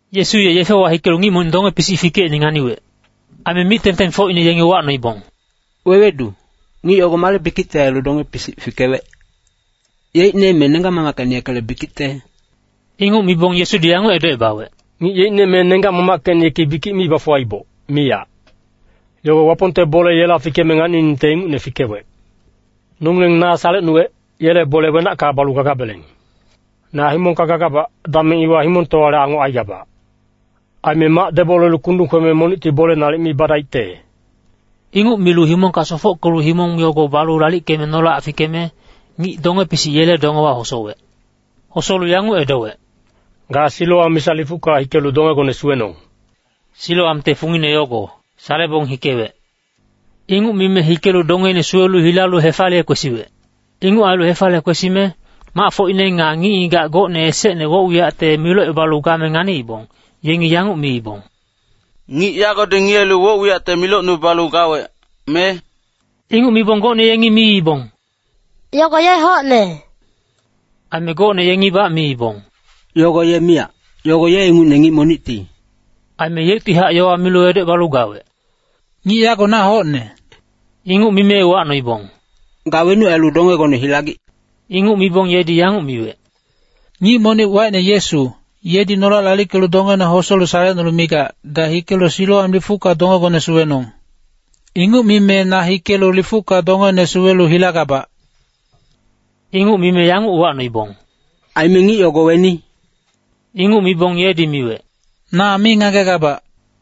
Yesu ye yefewa hikelu ngic monic donge-pisic fikeicne nganiwec. Aime mic-tengtengfocine yengi uwacnoibong, “Wewedu, ngic yogo male bikicte ailu donge-pisic fikewec? Yeicne me nenggac-mamackecine yekele bikicte?” Inguc mibong Yesudi yanguc edocebawec, “Ngic yeicne me nenggac-mamackecine yeki bikic mi bafuwaiboc, miyac. Yogo Wapongte bole yela fikeme nganiningte ingucne fikewec. Nongileng na salecnuwec, yele bole wenacka balu gadabeleng. Na himongka gagabac, dameng iwa himongtowale angoc aigabac. Aime mac debolelu kundung kweme monicti bole nalic mi badaicte.” Inguc milu himongka sofockelu himong yogo balu lalickeme nolac fikeme, ngic donge-pisic yele dongewa hosowec. Hosolu yanguc edowec, “Ga Siloam misa lifucka hikelu dongegone suwenong.” (Siloamte fungine yogo “Salebong hikewec.”) Inguc mime hikelu dongeine suwelu hilalu hefaliye kwesiwec. Inguc ailu hefaliye kwesime, macfocine nga ngic-ngigac gocne esecne woc-wiyacte milocebalu game nganiibong, yengi yanguc miibong, “Ngic yagodi ngiyelu woc-wiyacte milocnubalu gawec, me?” Inguc mibong gocne yengi miibong, “Yogo ye hocne.” Aime gocne yengibac miibong, “Yogo ye miyac, yogo ye ingucne ngic monicti.” Aime yeuctihac yowa milu edocebalu gawec, “Ngic yago na hocne.” Inguc mime uwacnoibong, “Ga wenuc ailu dongegone hilagic?” Inguc mibong yedi yanguc miwec, “Ngic monic wacine Yesu, yedi nolac lalickelu dongena hosolu salecnulu migac, ‘Ga hikelu Siloam lifucka dongegone suwenong.’ Inguc mime na hikelu lifucka dongene suwelu hilagabac.” Inguc mime yanguc uwacnoibong, “Aime ngic yogo weni?” Inguc mibong yedi miwec, “Na mi ngagegabac.”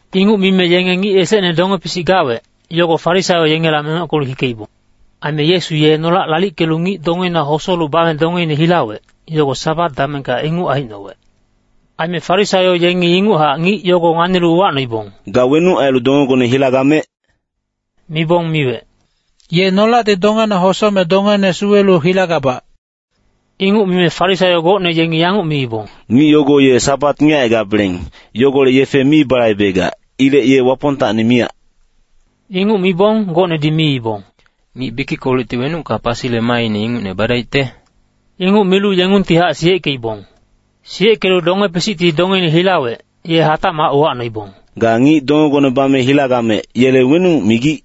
Inguc mime yenge ngic esecne donge-pisic gawec, yogo Farisaio yengela mengockelu hikeibong. Aime Yesu ye nolac lalickelu ngic dongeina hosolu bame dongeine hilawec, yogo Sabat damengka inguc aicnowec. Aime Farisaio yengi inguchac ngic yogo nganilu uwacnoibong, “Ga wenuc ailu dongegone hilagamec?” Mibong miwec, “Ye nolacti dongena hosome dongene suwelu hilagabac.” Inguc mime Farisaio gocne yengi yanguc miibong, “Ngic yogo ye Sabat ngiyecaigabeleng, yogolec yefe mi balaibegac. Ilec ye Wapongtacni miyac.” Inguc mibong gocnedi miibong, “Ngic bikickolecti wenucka pasile maaine ingucne badaicte?” Inguc milu yengungtihac siyeckeibong. Siyeckelu donge-pisicti dongeine hilawec, ye hatacmac uwacnoibong, “Ga ngic dongegone bame hilagamec, yele wenuc migic?”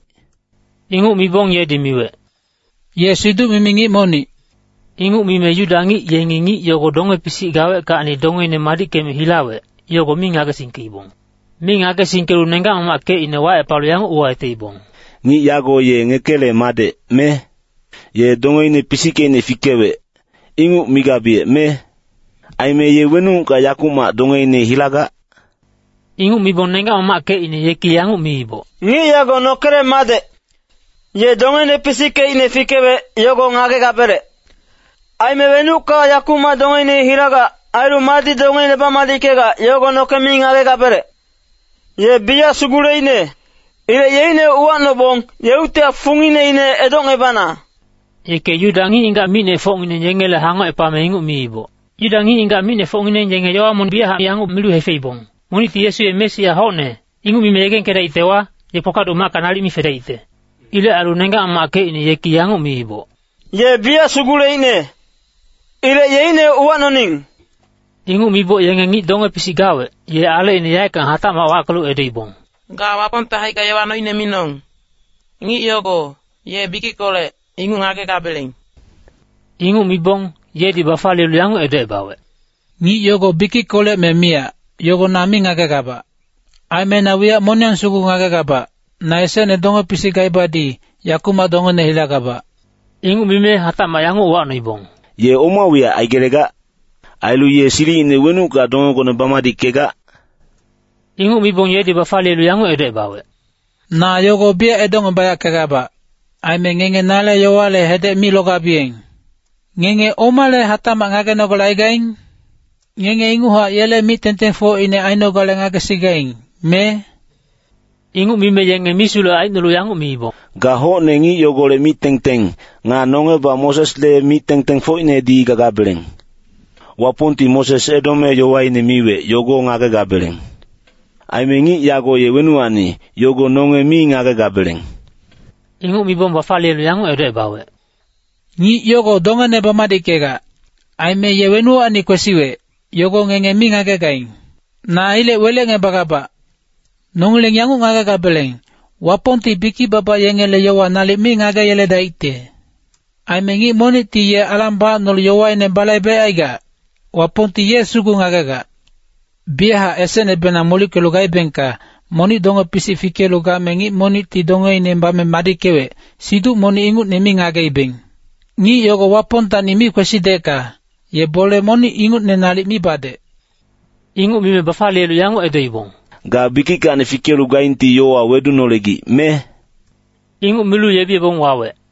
Inguc mibong yedi miwec, “Ye siduc-mimi ngic monic.” Inguc mime Yuda ngic yengi ngic yogo donge-pisic gaweckacni dongeine madickeme hilawec, yogo mi ngagesingkeibong. Mi ngagesingkelu nenggac-mamackecine wacepalu yanguc uwayeteibong, “Ngic yago ye ngekele madec, me? Ye dongeine pisickeicne fikewec, inguc migabiyec, me? Aime ye wenucka yakumac dongeine hilagac?” Inguc mibong nenggac-mamackecine yeki yanguc miiboc, “Ngic yago nokele madec. Ye dongeine pisickeicne fikewec, yogo ngagegabelec. Aime wenucka yakumac dongeine hilagac, ailu madi dongeine bamadickegac, yogo noke mi ngagegabelec. Ye biyac suguleicne. Ilec yeicne uwacnobong, yeuctihac fungineine edocngebana.” Yeke Yuda ngic-ngigac micnefocngineng yengele hangocepame inguc miiboc. Yuda ngic-ngigac micnefocngineng yenge yowa monic biyachac yanguc milu hefeibong, “Monicti ‘Yesu ye Mesia hocne’, inguc mime yegengkedaictewa, ye kpakpaduc macka nalic mi fedaicte.” Ilec ailu nenggac-mamackecine yeki yanguc miiboc, “Ye biyac suguleicne. Ilec yeicne uwacnoning.” Inguc miboc yenge ngic donge-pisic gawec, ye alecine yaeckang hatacmac wackelu edoibong, “Ga Wapongte haicka yowa noine minong. Ngic yogo, ye bikickolec, inguc ngagegabeleng.” Inguc mibong, yedi bafaliyelu yanguc edocebawec, “Ngic yogo bikickolec me miyac, yogo na mi ngagegabac. Aime na wiyac moniyang sugu ngagegabac, na esecne donge-pisic gaibadi, yakumac dongene hilagabac.” Inguc mime hatacmac yanguc uwacnoibong, “Ye oma wiyac aigelegac? Ailu ye silicine wenucka dongegone bamadickegac?” Inguc mibong yedi bafaliyelu yanguc edocebawec, “Na yogo biyac edocngebayackegabac. Aime ngenge nale yowale hedec mi logabiyeng. Ngenge omale hatacmac ngagenogale aigaing? Ngenge inguchac yele mic-tengtengfocine ainogale ngagesigaing, me?” Inguc mime yenge misulec aicnolu yanguc miibong, “Ga hocne ngic yogolec mic-tengteng, nga nongebac Mosesle mic-tengtengfocinedi gagabeleng. Wapongti Moses edome yowaine miwec, yogo ngagegabeleng. Aime ngic yago ye wenuwacni, yogo nonge mi ngagegabeleng.” Inguc mibong bafaliyelu yanguc edocebawec, “Ngic yogo dongene bamadickegac. Aime ye wenuwacni kwesiwec, yogo ngenge mi ngagegaing. Na ilec welecngebagabac. Nongileng yanguc ngagegabeleng, Wapongti bikic-baba yengele yowa nalic mi ngageyeledaicte. Aime ngic monicti ye alang bacnolu yowaine balaibecaigac, Wapongti ye sugu ngagegac. Biyachac esecnebenang molickelu gaibengka, ‘Monic donge-pisic fikelu game ngic monicti dongeine bame madickewec,’ siduc monic ingucne mi ngageibeng. Ngic yogo Wapongtacni mi kwesidecka, ye bole monic ingucne nalic mi badec.” Inguc mime bafaliyelu yanguc edoibong, “Ga bikickacni fikelu gaingti yowa wedunolegic, me?” Inguc milu yebiyebong wawec.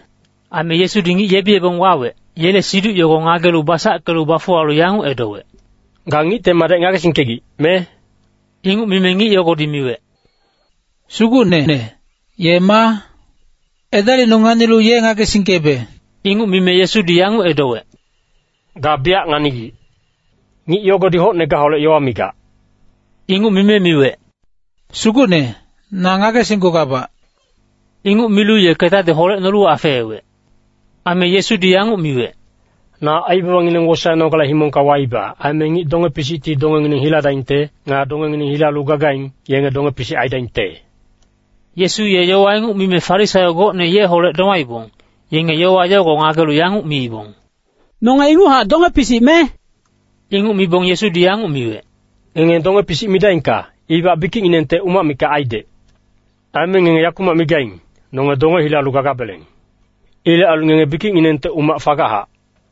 Aime Yesudi ngic yebiyebong wawec, yele siduc yogo ngagelu basackelu bafuwalu yanguc edowec, “Ga Ngicte Madec ngagesingkegic, me?” Inguc mime ngic yogodi miwec, “Sugucnene, ye maa? Edalicnung nganilu ye ngagesingkebe.” Inguc mime Yesudi yanguc edowec, “Ga biyac nganigic. Ngic yogodi hocne gaholec yowa migac.” Inguc mime miwec, “Sugucne, na ngagesinggugabac.” Inguc milu ye ketadi holecnolu afeewec. Aime Yesudi yanguc miwec, “Na aibabangineng wosaenogale himongka waiba. Aime ngic donge-pisicti dongengineng hiladaingte. Nga dongengineng hilalu gagaing, yenge donge-pisic aidaingte.” Yesu ye yowa inguc mime Farisaio gocne yeholec domaibong, yenge yowa yogo ngagelu yanguc miibong, “Nonge inguchac donge-pisic, me?” Inguc mibong Yesudi yanguc miwec, “Ngenge donge-pisic midaingka, ibac bikicnginengte umac mikac aidec. Aime ngenge yakumac migaing, ‘Nonge donge hilalu gagabeleng.’ Ilec ailu ngenge bikicnginengte umac fagachac.”